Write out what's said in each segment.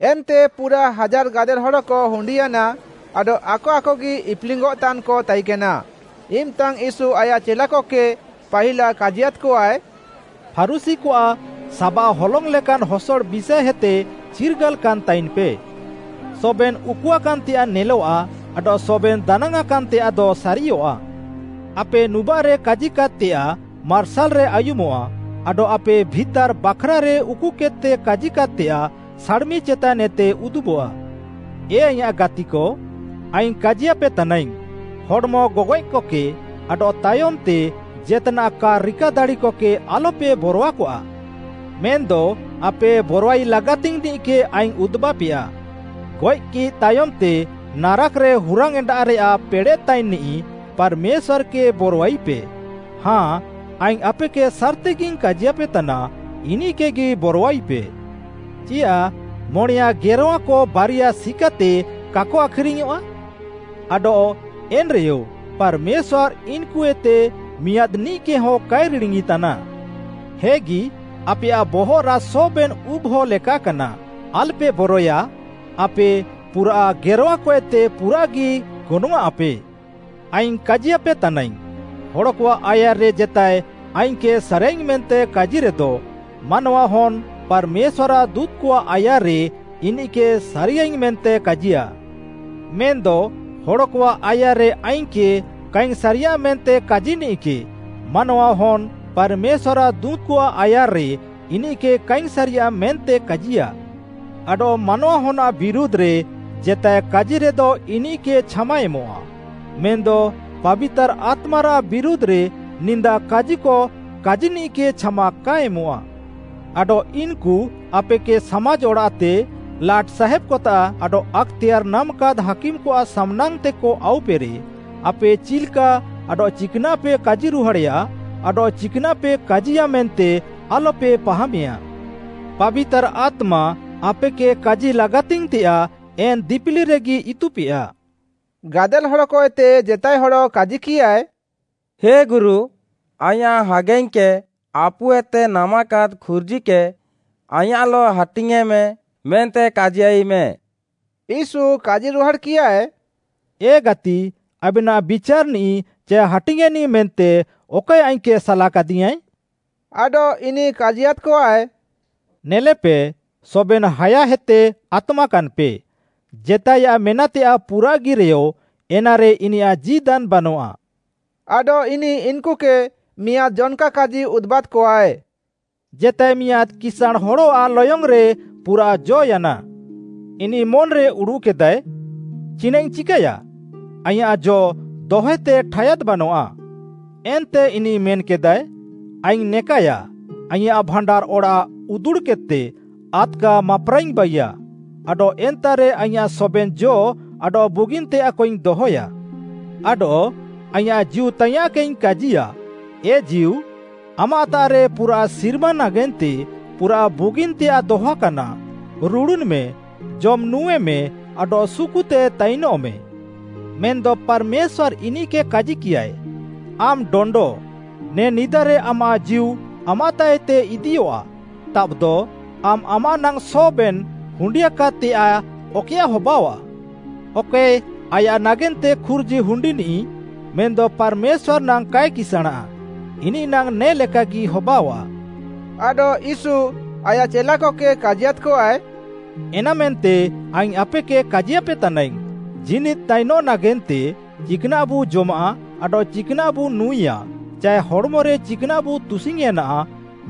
ଏନ୍ତେ ପୁରାଃ ହାଜାର୍‌ ଗାଦେଲ୍‌ ହଡ଼କ ହୁଣ୍ଡିୟାନା, ଆଡଃ ଆକ ଆକଗି ଇପ୍‌ଲିଙ୍ଗ୍‌ଅଃତାନ୍‌କ ତାଇକେନା, ଇମ୍‌ତାଙ୍ଗ୍‌ ୟୀଶୁ ଆୟାଃ ଚେଲାକକେ ପାହିଲା କାଜିୟାଦ୍‌କଆଏ, ଫାରୁଶୀକଆଃ ସାବାଃ ହଲଙ୍ଗ୍‌ ଲେକାନ୍‌ ହସଡ଼ ବିଷାଏହେତେ ଚିର୍ଗାଲାକାନ୍‌ ତାଇନ୍‌ପେ। ସବେନ୍‌ ଉକୁଆକାନ୍‌ତେୟାଃ ନେଲଆଃ ଆଡଃ ସବେନ୍‌ ଦାନାଙ୍ଗ୍‌ଆଁକାନ୍ ତେୟାଃଦ ସାରିୟଃଆ। ଆପେ ନୁବାଃରେ କାଜିକାଦ୍‌ତେୟାଃ ମାର୍ସାଲ୍‌ରେ ଆୟୁମଃଆ ଆଡଃ ଆପେ ଭିତାର୍‌ ବାଖ୍‌ରାରେ ଉକୁକେଦ୍‌ତେ କାଜିକାଦ୍‌ତେୟାଃ, ସାଡ଼୍‌ମି ଚେତାନ୍ଏତେ ଉଦୁବଃଆ। “ଏ ଆଇଁୟାଃ ଗାତିକ, ଆଇଙ୍ଗ୍‌ କାଜିୟାପେ ତାନାଇଙ୍ଗ୍‌, ହଡ଼୍‌ମ ଗଗଏଃକକେ, ଆଡଃ ତାୟମ୍‌ତେ ଜେତ୍‌ନାଃ କା ରିକା ଦାଡ଼ିକକେ ଆଲ୍‌ପେ ବରଆକଆ। ମେନ୍‌ଦ ଆପେ ବରଆଇ ଲାଗାତିଙ୍ଗ୍‌ନିଃକେ ଆଇଙ୍ଗ୍‌ ଉଦୁବାପେୟା, ଗଏଃକି ତାୟମ୍‌ତେ ନାରାକ୍‌ରେ ହୁରାଙ୍ଗ୍‌ଏଣ୍ଡାରେୟାଃ ପେଡ଼େଃତାଇନ୍‌ନିଃ ପାର୍‌ମେଶ୍ୱାର୍‌କେ ବରଆଇପେ; ହାଁ, ଆଇଙ୍ଗ୍‌ ଆପେକେ ସାର୍‌ତିଗିଙ୍ଗ୍‌ କାଜିୟାପେତାନା, ଇନିଃକେଗି ବରଆଇପେ। “ଚିୟାଃ ମଣେୟାଁ ଗେରଁୱାକ ବାରିଆ ସିକାତେ କାକ ଆଖ୍‌ରିଙ୍ଗ୍‌ୟଃଆ? ଆଡଃ ଏନ୍‌ରେୟ ପାର୍‌ମେଶ୍ୱାର୍‌ ଇନ୍‌କୁଏତେ ମିଆଁଦ୍‌ନିଃକେହଁ କାଏ ରିଡ଼ିଙ୍ଗ୍‌ଇତାନା। ହେଗି, ଆପେୟାଃ ବହଃରାଃ ସବେନ୍‌ ଉବ୍‌ହ ଲେକାକାନା। ଆଲ୍‌ପେ ବରଏୟା, ଆପେ ପୁରାଃ ଗେରଁୱାକଏତେ ପୁରାଃଗି ଗନଙ୍ଗ୍‌ଆଃଁପେ। “ଆଇଙ୍ଗ୍‌ କାଜିୟାପେ ତାନାଇଙ୍ଗ୍‌, ହଡ଼କଆଃ ଆୟାର୍‌ରେ ଜେତାଏ ଆଇଙ୍ଗ୍‌କେ ସାରିୟାଃଇଙ୍ଗ୍‌ ମେନ୍ତେ କାଜିରେଦ ମାନୱାହନ୍‌ ପାର୍‌ମେଶ୍ୱାର୍‌ଆଃ ଦୁଁତ୍‌କଆଃ ଆୟାର୍‌ରେ ଇନିଃକେ ସାରିୟାଃଇଙ୍ଗ୍‌ ମେନ୍ତେ କାଜିୟା। ମେନ୍‌ଦ ହଡ଼କଆଃ ଆୟାର୍‌ରେ ଆଇଙ୍ଗ୍‌କେ କାଇଙ୍ଗ୍‌ ସାରିୟାଃ ମେନ୍ତେ କାଜିନିଃକେ ମାନୱାହନ୍‌ହ ପାର୍‌ମେଶ୍ୱାର୍‌ଆଃ ଦୁଁତ୍‌କଆଃ ଆୟାର୍‌ରେ ଇନିଃକେ କାଇଙ୍ଗ୍‌ ସାରିୟାଃ ମେନ୍ତେ କାଜିୟା। “ଆଡଃ ମାନୱାହନ୍‌ଆଃ ବିରୁଧ୍‌ରେ ଜେତାଏ କାଜିରେଦ ଇନିଃକେ ଛାମା ଏମଃଆ, ମେନ୍‌ଦ ପାବିତାର୍‌ ଆତ୍ମାରାଃ ବିରୁଧ୍‌ରେ ନିନ୍ଦା କାଜିକ କାଜିନିଃକେ ଛାମା କା ଏମଃଆ। “ଆଡଃ ଇନ୍‌କୁ ଆପେକେ ସାମାଜ୍‌ ଅଡ଼ାଃତେ, ଲାଟ୍‌ସାହାବ୍‌କତାଃ ଆଡଃ ଆକ୍‌ତେୟାର୍‌ ନାମାକାଦ୍‌ ହାକିମ୍‌କଆଃ ସାମ୍‌ନାଙ୍ଗ୍‌ତେକ ଆଉପେରେ, ଆପେ ଚିଲ୍‌କା ଆଡଃ ଚିକ୍‌ନାଃପେ କାଜିରୁହାଡ଼େୟା ଆଡଃ ଚିକ୍‌ନାଃପେ କାଜିୟାଃ ମେନ୍ତେ ଆଲ୍‌ପେ ପାହାମେୟା। ପାବିତାର୍‌ ଆତ୍ମା ଆପେକେ କାଜି ଲାଗାତିଙ୍ଗ୍‌ତେୟାଃ ଏନ୍‌ ଦିପିଲିରେଗି ଇତୁପେୟା।” ଗାଦେଲ୍‌ ହଡ଼କଏତେ ଜେତାଏ ହଡ଼ କାଜିକିୟାଏ, “ହେ ଗୁରୁ, ଆଇଁୟାଃ ହାଗାଇଙ୍ଗ୍‌କେ ଆପୁଏତେ ନାମାକାଦ୍‌ ଖୁର୍ଜିକେ ଆଇଁୟାଃଲଃ ହାଟିଙ୍ଗ୍‌ୟେଁମେ ମେନ୍ତେ କାଜିୟାଇମେ।” ୟୀଶୁ କାଜିରୁହାଡ଼୍‌କିୟାଏ, “ଏ ଗାତି, ଆବେନାଃ ବିଚାର୍‌ନିଃ ଚାଏ ହାଟିଙ୍ଗ୍‌ଏନିଃ ମେନ୍ତେ ଅକଏ ଆଇଙ୍ଗ୍‌କେ ସାଲାକାଦିଙ୍ଗ୍‌ଆଏ?” ଆଡଃ ଇନିଃ କାଜିୟାଦ୍‌କଆଏ, “ନେଲେପେ, ସବେନ୍‌ ହାୟାହେତେ ଆତମାକାନ୍‌ପେ; ଜେତାଏୟାଃ ମେନାଃତେୟାଃ ପୁରାଃଗିରେୟ ଏନାରେ ଇନିୟାଃ ଜୀଦାନ୍‌ ବାନଆଃ।” ଆଡଃ ଇନିଃ ଇନ୍‌କୁକେ ମିଆଁଦ୍‌ ଜନ୍‌କା କାଜି ଉଦୁବାଦ୍‌କଆଏ, “ଜେତାଏ ମିଆଁଦ୍‌ କିସାଁଣ୍‌ ହଡ଼ଆଃ ଲୟଙ୍ଗ୍‌ରେ ପୁରାଃ ଜ ୟାନା। ଇନିଃ ମନ୍‌ରେ ଉଡ଼ୁଃକେଦାଏ, ଚିନାଃଇଙ୍ଗ୍‌ ଚିକାୟା? ଆଇଁୟାଃ ଜ ଦହତେ ଠାୟାଦ୍ ବାନଆଃ। ଏନ୍ତେ ଇନିଃ ମେନ୍‌କେଦାଏ, ଆଇଙ୍ଗ୍‌ ନେକାୟା, ଆଇଁୟାଃ ଭାଣ୍ଡାର୍‌ ଅଡ଼ାଃ ଉତୁଡ଼୍‌କେଦ୍‌ତେ ଆଦ୍‌କା ମାପ୍‌ରାଙ୍ଗ୍‌ଇଙ୍ଗ୍‌ ବାଇୟାଃ, ଆଡଃ ଏନ୍ତାଃରେ ଆଇଁୟାଃ ସବେନ୍‌ ଜ ଆଡଃ ବୁଗିନ୍‌ତେୟାଃକଇଙ୍ଗ୍‌ ଦହୟା। ଆଡଃ ଆଇଙ୍ଗ୍‌ ଜୀଉତାଇୟାଁଃକେଇଙ୍ଗ୍‌ କାଜିୟା, ଏ ଜୀଉ, ଆମାଃତାଃରେ ପୁରାଃ ସିର୍ମା ନାଗେନ୍ତେ ପୁରାଃ ବୁଗିନ୍‌ତେୟାଃ ଦହଆକାନା, ରୁଡ଼ୁନ୍‌ମେ, ଜମ୍ ନୁଁଏମେ ଆଡଃ ସୁକୁତେ ତାଇନଃମେ। ମେନ୍‌ଦ ପାର୍‌ମେଶ୍ୱାର୍‌ ଇନିଃକେ କାଜିକିୟାଏ, ଆମ୍‌ ଡଣ୍ଡ, ନେ ନିଦାରେ ଆମାଃ ଜୀଉ ଆମାଃତାଃଏତେ ଇଦିୟଃଆ, ତାବ୍‌ଦ ଆମ୍‌ ଆମାଃ ନାଙ୍ଗ୍‌ ସବେନ୍‌ ହୁଣ୍ଡିଆକାଦ୍‌ତେୟାଃ ଅକଏୟାଃ ହବାଅୱା।” ଅକଏ ଆୟାଃ ନାଗେନ୍ତେ ଖୁର୍ଜି ହୁଣ୍ଡିନିଃ ମେନ୍‌ଦ ପାର୍‌ମେଶ୍ୱାର୍‌ ନାଙ୍ଗ୍‌ କାଏ କିସାଁଣାଃ, ଇନିଃନାଙ୍ଗ୍‌ ନେ ଲେକାଗି ହବାଅୱା। ଆଡଃ ୟୀଶୁ ଆୟାଃ ଚେଲାକକେ କାଜିୟାଦ୍‌କଆଏ, “ଏନାମେନ୍ତେ ଆଇଙ୍ଗ୍‌ ଆପେକେ କାଜିପେତାନାଇଙ୍ଗ୍‌, ଜୀନିଦ୍‌ ତାଇନଃ ନାଗେନ୍ତେ ଚିକ୍‌ନାଃବୁ ଜମାଃ ଆଡଃ ଚିକ୍‌ନାଃବୁ ନୁଁଏୟା, ଚାଏ ହଡ଼୍‌ମରେ ଚିକ୍‌ନାଃବୁ ତୁସିଙ୍ଗ୍‌ୟେଁନା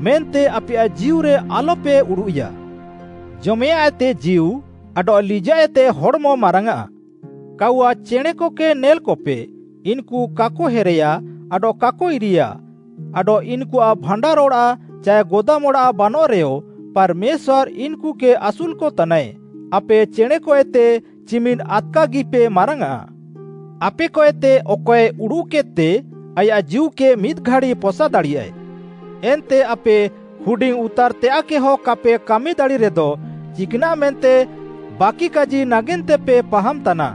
ମେନ୍ତେ ଆପେୟାଃ ଜୀଉରେ ଆଲ୍‌ପେ ଉଡ଼ୁଃୟା। ଜମେୟାଁଃଏତେ ଜୀଉ ଆଡଃ ଲିଜାଃଏତେ ହଡ଼୍‌ମ ମାରାଙ୍ଗ୍‌ଆଃ। କାଉୱା ଚେଣେଁକକେ ନେଲ୍‌କପେ, ଇନ୍‌କୁ କାକ ହେରେୟା ଆଡଃ କାକ ଇରେୟା, ଆଡଃ ଇନ୍‌କୁଆଃ ଭାଣ୍ଡାର୍‌ ଅଡ଼ାଃ ଚାଏ ଗୋଦାମ୍ ଅଡ଼ାଃ ବାନଃରେୟ, ପାର୍‌ମେଶ୍ୱାର୍‌ ଇନ୍‌କୁକେ ଆସୁଲ୍‌କତାନାଏ। ଆପେ ଚେଣେଁକଏତେ ଚିମିନ୍‌ ଆଦ୍‌କାଗିପେ ମାରାଙ୍ଗ୍‌ଆଃ! ଆପେକଏତେ ଅକଏ ଉଡୁଃକେଦ୍‌ତେ ଆୟାଃ ଜୀଉକେ ମିଦ୍‌ ଘାଡ଼ି ପସାଦାଡ଼ିୟାଏ। ଏନ୍ତେ ଆପେ ହୁଡିଙ୍ଗ୍‌ଉତାର୍‌ତେୟାଃକେହ କାପେ କାମିଦାଡ଼ିରେଦ ଚିକ୍‌ନାଃ ମେନ୍ତେ ବାକିକାଜି ନାଗେନ୍ତେପେ ପାହାମ୍‌ତାନା।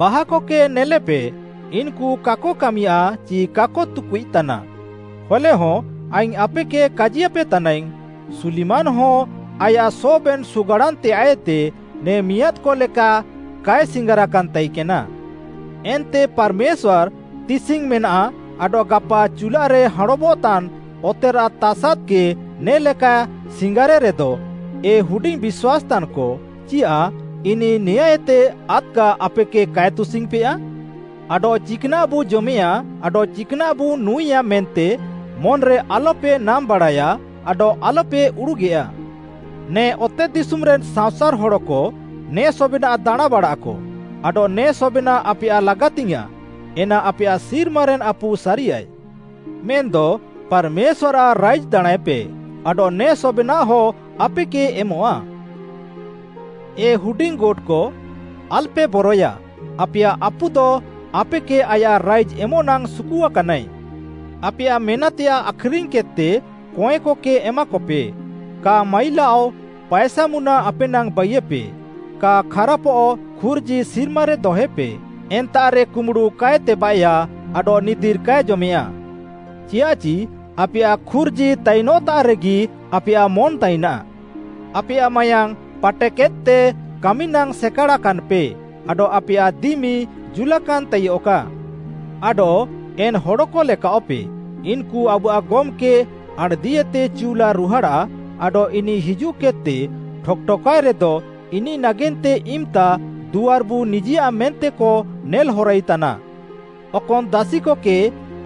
ବାହାକକେ ନେଲେପେ, ଇନ୍‌କୁ କାକ କାମିୟାଃ ଚି କାକ ତୁକୁଇତାନା, ହଲେହଁ ଆଇଙ୍ଗ୍‌ ଆପେକେ କାଜିୟାପେ ତାନାଇଙ୍ଗ୍‌, ସୁଲିମାନ୍‌ହଁ ଆୟାଃ ସବେନ୍‌ ସୁଗାଡ଼ାନ୍‌ତେୟାଃଏତେ ନେ ମିଆଁଦ୍‌କ ଲେକା କାଏ ସିଙ୍ଗାରାକାନ୍ ତାଇକେନା। ଏନ୍ତେ ପାର୍‌ମେଶ୍ୱାର୍‌ ତିସିଙ୍ଗ୍‌ ମେନାଃ ଆଡଃ ଗାପା ଚୁଲ୍ଲାରେ ହାଁଣବଃତାନ୍‌ ଅତେରାଃ ତାସାଦ୍‌କେ ନେ ଲେକାଏ ସିଙ୍ଗାରେରେଦ, ଏ ହୁଡିଙ୍ଗ୍‌ ବିଶ୍ୱାସ୍‌ତାନ୍‌କ, ଚିୟାଃ ଇନିଃ ନେଆଁଁଏତେ ଆଦ୍‌କା ଆପେକେ କାଏ ତୁସିଙ୍ଗ୍‌ପେୟା? “ଆଡଃ ଚିକ୍‌ନାଃବୁ ଜମେୟାଁ ଆଡଃ ଚିକ୍‌ନାଃବୁ ନୁଁଏୟା ମେନ୍ତେ ମନ୍‌ରେ ଆଲ୍‌ପେ ନାମ୍‌ବାଡ଼ାୟା ଆଡଃ ଆଲ୍‌ପେ ଉଡ଼ୁଗେୟା। ନେ ଅତେଦିଶୁମ୍‌ରେନ୍‌ ସାଅଁସାର୍‌ ହଡ଼କ ନେ ସବେନାଃ ଦାଣାଁଁବାଡ଼ାଃକ, ଆଡଃ ନେ ସବେନାଃ ଆପେୟାଃ ଲାଗାତିଙ୍ଗ୍‌ୟାଁଃ, ଏନା ଆପେୟାଃ ସିର୍ମାରେନ୍‌ ଆପୁ ସାରିୟାଏ। ମେନ୍‌ଦ ପାର୍‌ମେଶ୍ୱାର୍‌ଆଃ ରାଇଜ୍‌ ଦାଣାଁଁଏପେ ଆଡଃ ନେ ସବେନାଃହ ଆପେକେ ଏମଃଆ। “ଏ ହୁଡିଙ୍ଗ୍‌ ଗୋଟ୍‌କ ଆଲ୍‌ପେ ବରଏୟା ଆପେୟାଃ ଆପୁଦ ଆପେକେ ଆୟାଃ ରାଇଜ୍‌ ଏମଃନାଙ୍ଗ୍‌ ସୁକୁଆକାନାଏ। ଆପେୟାଃ ମେନାଃତେୟାଃ ଆଖ୍‌ରିଙ୍ଗ୍‌ କେଦ୍‌ତେ କଏଁକକେ ଏମାକପେ, କା ମାଇଲାଅଃ ପାଏସାମୁନା ଆପେନାଙ୍ଗ୍‌ ବାଇୟେପେ, କା ଖାରାପଃ ଖୁର୍ଜି ସିର୍ମାରେ ଦହଏପେ, ଏନ୍ତାଃରେ କୁମ୍ବୁଡ଼ୁ କାଏ ତେବାଃଏୟା ଆଡଃ ନିଦିର୍‌ କାଏ ଜମେୟାଁ। ଚିୟାଃଚି ଆପେୟାଃ ଖୁର୍ଜି ତାଇନଃତାଃରେଗି ଆପେୟାଃ ମନ୍‌ ତାଇନାଃ। “ଆପେୟାଃ ମାୟାଙ୍ଗ୍‌ ପାଟେକେଦ୍‌ତେ କାମିନାଙ୍ଗ୍‌ ସେକାଡ଼ାକାନ୍‌ପେ ଆଡଃ ଆପେୟାଃ ଦିମି ଜୁଲାକାନ୍‌ ତାଇୟଃକା। ଆଡଃ ଏନ୍‌ ହଡ଼କଲେକାଅଃପେ, ଇନ୍‌କୁ ଆବୁଆଃ ଗମ୍‌କେ ଆଣ୍‌ଦିଏତେ ଚିଉଲାଏ ରୁହାଡ଼ାଃ ଆଡଃ ଇନିଃ ହିଜୁଃକେଦ୍‌ତେ ଠକ୍‌ ଠକାଏରେଦ ଇନିଃ ନାଗେନ୍ତେ ଇମ୍‌ତା ଦୁଆର୍‌ବୁ ନିଜେୟା ମେନ୍ତେକ ନେଲ୍‌ହରାଇତାନା। ଅକନ୍‌ ଦାସିକକେ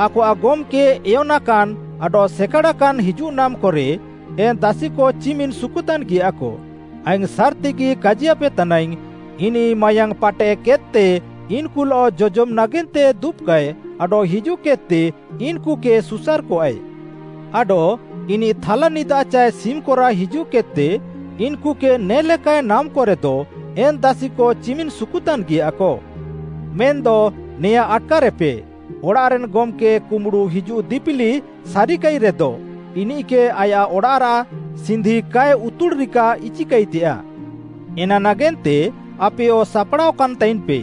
ଆକଆଃ ଗମ୍‌କେ ଏୟନାକାନ୍‌ ଆଡଃ ସେକାଡ଼ାକାନ୍‌ ହିଜୁଃନାମ୍‌କରେ ଏନ୍‌ ଦାସିକ ଚିମିନ୍‌ ସୁକୁତାନ୍‌ଗିୟାକ, ଆଇଙ୍ଗ୍‌ ସାର୍‌ତିଗି କାଜିୟାପେ ତାନାଇଙ୍ଗ୍‌, ଇନିଃ ମାୟାଙ୍ଗ୍‌ ପାଟେକେଦ୍‌ତେ ଇନ୍‌କୁଲଃ ଜଜମ୍‌ ନାଗେନ୍ତେ ଦୁବ୍‌କଆଏ ଆଡଃ ହିଜୁଃକେଦ୍‌ତେ ଇନ୍‌କୁକେ ସୁସାର୍‌କଆଏ। ଆଡଃ ଇନିଃ ଥାଲାନିଦା ଚାଏ ସିମ୍‌କରାଃ ହିଜୁଃକେଦ୍‌ତେ ଇନ୍‌କୁକେ ନେ ଲେକାଏ ନାମ୍‌କରେଦ ଏନ୍‌ ଦାସିକ ଚିମିନ୍‌ ସୁକୁତାନ୍‌ଗିୟାକ। ମେନ୍‌ଦ ନେଆଁଁ ଆଟ୍‌କାରେପେ, ଅଡ଼ାଃରେନ୍‌ ଗମ୍‌କେ କୁମ୍ବୁଡ଼ୁ ହିଜୁଃ ଦିପିଲି ସାରିକାଇରେଦ ଇନିଃକେ ଆୟାଃ ଅଡ଼ାଃରାଃ ସିନ୍ଧି କାଏ ଉତୁଡ଼୍‌ରିକା ଇଚିକାଇତେୟାଃ। ଏନା ନାଗେନ୍ତେ ଆପେୟ ସାପ୍‌ଡ଼ାଅକାନ୍‍ ତାଇନ୍‌ପେ,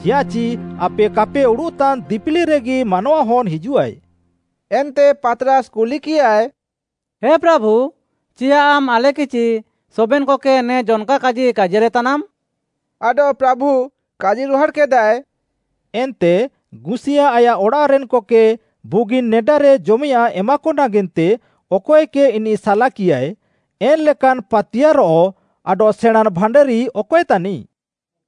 ଚିୟାଃଚି ଆପେ କାପେ ଉଡ଼ୁଃତାନ୍‌ ଦିପିଲିରେଗି ମାନୱାହନ୍‌ ହିଜୁଃଆଏ।” ଏନ୍ତେ ପାତ୍‌ରାସ୍‌ କୁଲିକିୟାଏ, “ହେ ପ୍ରାଭୁ ଚିୟାଃ ଆମ୍‌ ଆଲେକେ ଚି ସବେନ୍‌କକେ ନେ ଜନ୍‌କା କାଜି କାଜିୟାଲେତାନାମ୍‌?” ଆଡଃ ପ୍ରାଭୁ କାଜିରୁହାଡ଼୍‌କେଦାଏ, “ଏନ୍ତେ ଗୁସିୟାଁ ଆୟାଃ ଅଡ଼ାଃରେନ୍‌କକେ ବୁଗିନ୍‌ ନେଡାରେ ଜମେୟାଃଁ ଏମାକ ନାଗେନ୍ତେ ଅକଏକେ ଇନିଃ ସାଲାକିଆଏ, ଏନ୍‌ଲେକାନ୍‌ ପାତିୟାର୍‌ରଃ ଆଡଃ ସେଣାଁଁନ୍‌ ଭାଣ୍ଡାରି ଅକଏ ତାନିଃ?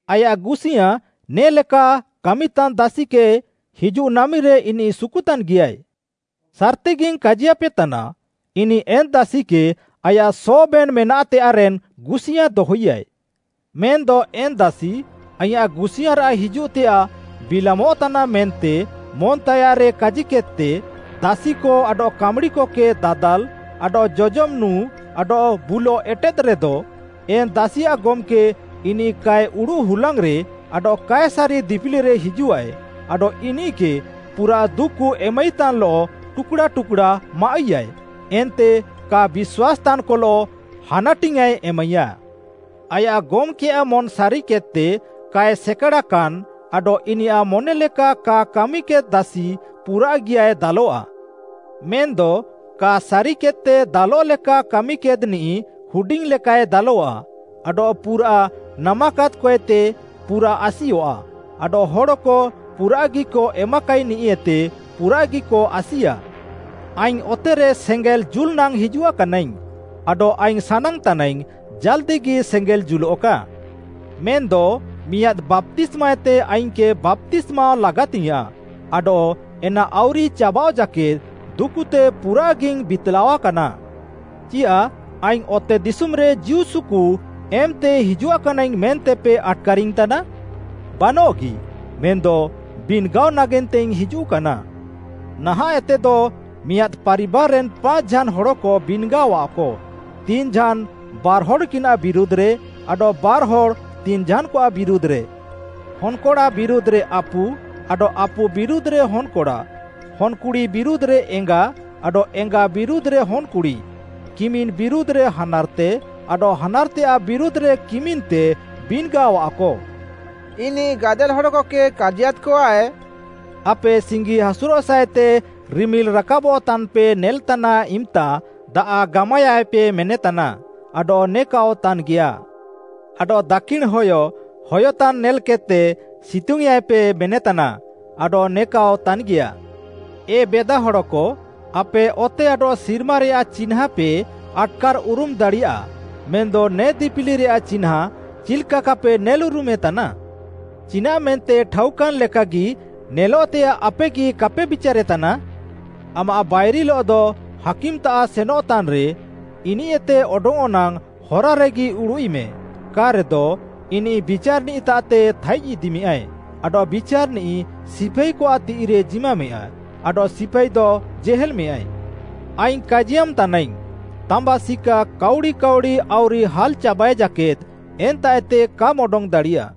ଆୟାଃ ଗୁସିୟାଁ ନେ'ଲେକା କାମିତାନ୍ ଦାସିକେ ହିଜୁଃ ନାମିରେ ଇନିଃ ସୁକୁତାନ୍‌ଗିୟାଏ। ସାର୍‌ତିଗିଙ୍ଗ୍‌ କାଜିୟାପେତାନା, ଇନିଃ ଏନ୍‌ ଦାସିକେ ଆୟାଃ ସବେନ୍‌ ମେନାଃତେୟାଃରେନ୍‌ ଗୁସିୟାଁ ଦହଇୟାଏ। ମେନ୍‌ଦ ଏନ୍‌ ଦାସି, ଆଇଁୟାଃ ଗୁସିୟାଁରାଃ ହିଜୁଃତେୟାଃ ବିଲାମଃତାନାଃ ମେନ୍ତେ ମନ୍‌ତାୟାଃରେ କାଜିକେଦ୍‌ତେ ଦାସିକ ଆଡଃ କାମ୍‌ଡ଼ିକକେ ଦାଦାଲ୍‌, ଆଡଃ ଜଜମ୍‌ ନୁଁ ଆଡଃ ବୁଲଃ ଏଟେଦ୍‌ରେଦ, ଏନ୍‌ ଦାସିଆଃ ଗମ୍‌କେ ଇନିଃ କାଏ ଉଡ଼ୁଃ ହୁଲାଙ୍ଗ୍‌ରେ ଆଡଃ କାଏ ସାରି ଦିପିଲିରେ ହିଜୁଃଆଏ ଆଡଃ ଇନିଃକେ ପୁରାଃ ଦୁକୁ ଏମାଇତାନ୍‌ଲଃ ଟୁକ୍‌ଡ଼ା ଟୁକ୍‌ଡ଼ା ମାଆଃଇୟାଏ, ଏନ୍ତେ କା ବିଶ୍ୱାସ୍‌ତାନ୍‌କଲଃ ହାନାଟିଙ୍ଗ୍‌ଆଏ ଏମାଇୟା। “ଆୟାଃ ଗମ୍‌କେୟାଃ ମନ୍‌ ସାରିକେଦ୍‌ତେ କାଏ ସେକାଡ଼ାକାନ୍‌ ଆଡଃ ଇନିୟାଃ ମନେଲେକା କା କାମିକେଦ୍‌ ଦାସି ପୁରାଃଗିୟାଏ ଦାଲଃଆ। ମେନ୍‌ଦ କା ସାରିକେଦ୍‌ତେ ଦାଲଃଲେକା କାମିକେଦ୍‌ନିଃ ହୁଡିଙ୍ଗ୍‌ଲେକାଏ ଦାଲଃଆ। ଆଡଃ ପୁରାଃ ନାମାକାଦ୍‌କଏତେ ପୁରାଃ ଆସିୟଃଆ; ଆଡଃ ହଡ଼କ ପୁରାଃଗିକ ଏମାକାଇନିଃଏତେ ପୁରାଃଗିକ ଆସିୟା। “ଆଇଙ୍ଗ୍‌ ଅତେରେ ସେଙ୍ଗେଲ୍‌ ଜୁଲ୍‌ନାଙ୍ଗ୍‌ ହିଜୁଆକାନାଇଙ୍ଗ୍‌, ଆଡଃ ଆଇଙ୍ଗ୍‌ ସାନାଙ୍ଗ୍‌ତାନାଇଙ୍ଗ୍‌, ଜାଲ୍‌ଦିଗି ସେଙ୍ଗେଲ୍‌ ଜୁଲଃକା। ମେନ୍‌ଦ ମିଆଁଦ୍‌ ବାପ୍ତିସ୍ମାଏତେ ଆଇଙ୍ଗ୍‌କେ ବାପ୍ତିସ୍ମାଅଃ ଲାଗାତିଙ୍ଗ୍‌ୟାଁଃ, ଆଡଃ ଏନା ଆଉରିଚାବାଃଅ ଜାକେଦ୍‌ ଦୁକୁତେ ପୁରାଃଗିଇଙ୍ଗ୍‌ ବିତ୍‌ଲାଅକାନା। ଚିୟାଃ ଆଇଙ୍ଗ୍‌ ଅତେଦିଶୁମ୍‌ରେ ଜୀଉସୁକୁ ଏମ୍‌ତେ ହିଜୁଆକାନାଇଙ୍ଗ୍‌ ମେନ୍ତେପେ ଆଟ୍‌କାରିଙ୍ଗ୍‌ତାନା? ବାନଃଗି, ମେନ୍‌ଦ ବିନ୍‌ଗାଅ ନାଗେନ୍ତେଇଙ୍ଗ୍‌ ହିଜୁଃକାନା। ନାହାଁଃଏତେଦ ମିଆଁଦ୍‌ ପାରିବାର୍‌ରେନ୍‌ ପାଞ୍ଚ୍‌ଝାନ୍‌ ହଡ଼କ ବିନ୍‌ଗାଅଆଃକ, ତିନ୍‌ଝାନ୍‌ ବାର୍‌ହଡ଼୍‌କିନାଃ ବିରୁଧ୍‌ରେ ଆଡଃ ବାର୍‌ହଡ଼୍‌ ତିନ୍‌ଝାନ୍‌କଆଃ ବିରୁଧ୍‌ରେ। ହନ୍‌କଡ଼ା ବିରୁଧ୍‌ରେ ଆପୁ, ଆଡଃ ଆପୁ ବିରୁଧ୍‌ରେ ହନ୍‌କଡ଼ା, ହନ୍‌କୁଡ଼ି ବିରୁଧ୍‌ରେ ଏଙ୍ଗା, ଆଡଃ ଏଙ୍ଗା ବିରୁଧ୍‌ରେ ହନ୍‌କୁଡ଼ି, କିମିନ୍‌ ବିରୁଧ୍‌ରେ ହାନାର୍‌ତେ ଆଡଃ ହାନାର୍‌ତେୟାଃ ବିରୁଧ୍‌ରେ କିମିନ୍‌ତେ, ବିନ୍‌ଗାଅଆଃକ।” ଇନିଃ ଗାଦେଲ୍‌ ହଡ଼କକେ କାଜିୟାଦ୍‌କଆଏ, ଆପେ ସିଙ୍ଗିହାସୁରଃସାଃଏତେ ରିମିଲ୍‌ ରାକାବ୍‌ତାନ୍‌ପେ ନେଲେତାନ୍ ଇମ୍‌ତା ଦାଆଃ ଗାମାୟାଏ ପେ ମେନେତାନା ଆଡଃ ନେକାଅଃ ତାନ୍‌ଗିୟାଃ। ଆଡଃ ଦାକ୍ଷିଣ୍‌ ହୟ ହୟତାନ୍‌ ନେଲ୍‌କେଦ୍‌ତେ ସିତୁଙ୍ଗ୍‌ୟେଁଆଏ ପେ ମେନେତାନା ଆଡଃ ନେକାଅଃ ତାନ୍‌ଗିୟାଃ। ଏ ବେଦାହଡ଼କ, ଆପେ ଅତେ ଆଡଃ ସିର୍ମାରେୟାଃ ଚିହ୍ନାଁପେ ଆଟ୍‌କାର୍‌ଉରୁମ୍‌ ଦାଡ଼ିୟାଃ ମେନ୍‌ଦ ନେ ଦିପିଲିରେୟାଃ ଚିହ୍ନାଁ ଚିଲ୍‌କା କାପେ ନେଲ୍‌ଉରୁମେତାନା? ଚିନାଃମେନ୍ତେ ଠାଉକାନ୍‌ ଲେକାଗି ନେଲଃତେୟାଃ ଆପେଗି କାପେ ବିଚାରେତାନା? ଆମାଃ ବାଇରିଲଃଦ ହାକିମ୍‌ତାମ୍‌ ସେନଃତାନ୍‌ରେ ଇନିଃଏତେ ଅଡଙ୍ଗ୍‌ଅଃ ନାଙ୍ଗ୍‌ ହରାରେଗି ଉଡ଼ୁଃଇମେ, କା'ରେଦ ଇନିଃ ବିଚାର୍‌ନିଃତାଃତେ ଥାଇଜ୍‌ଇଦିମେଁୟାଏ, ଆଡଃ ବିଚାର୍‌ନିଃ ସିପାଇକଆଃ ତିଃଇରେ ଜିମାମେଁୟା ଆଡଃ ସିପାଇଦ ଜେହେଲ୍‌ମେଁୟାଏ। ଆଇଙ୍ଗ୍‌ କାଜିୟାମ୍‌ ତାନାଇଙ୍ଗ୍‌, ତାମ୍ବା ସିକା କାଉଡ଼ି କାଉଡ଼ି ଆଉରି ହାଲ୍‌ଚାବାଏ ଜାକେଦ୍‌ ଏନ୍ତାଃଏତେ କାମ୍‌ ଅଡଙ୍ଗ୍‌ ଦାଡ଼ିୟା।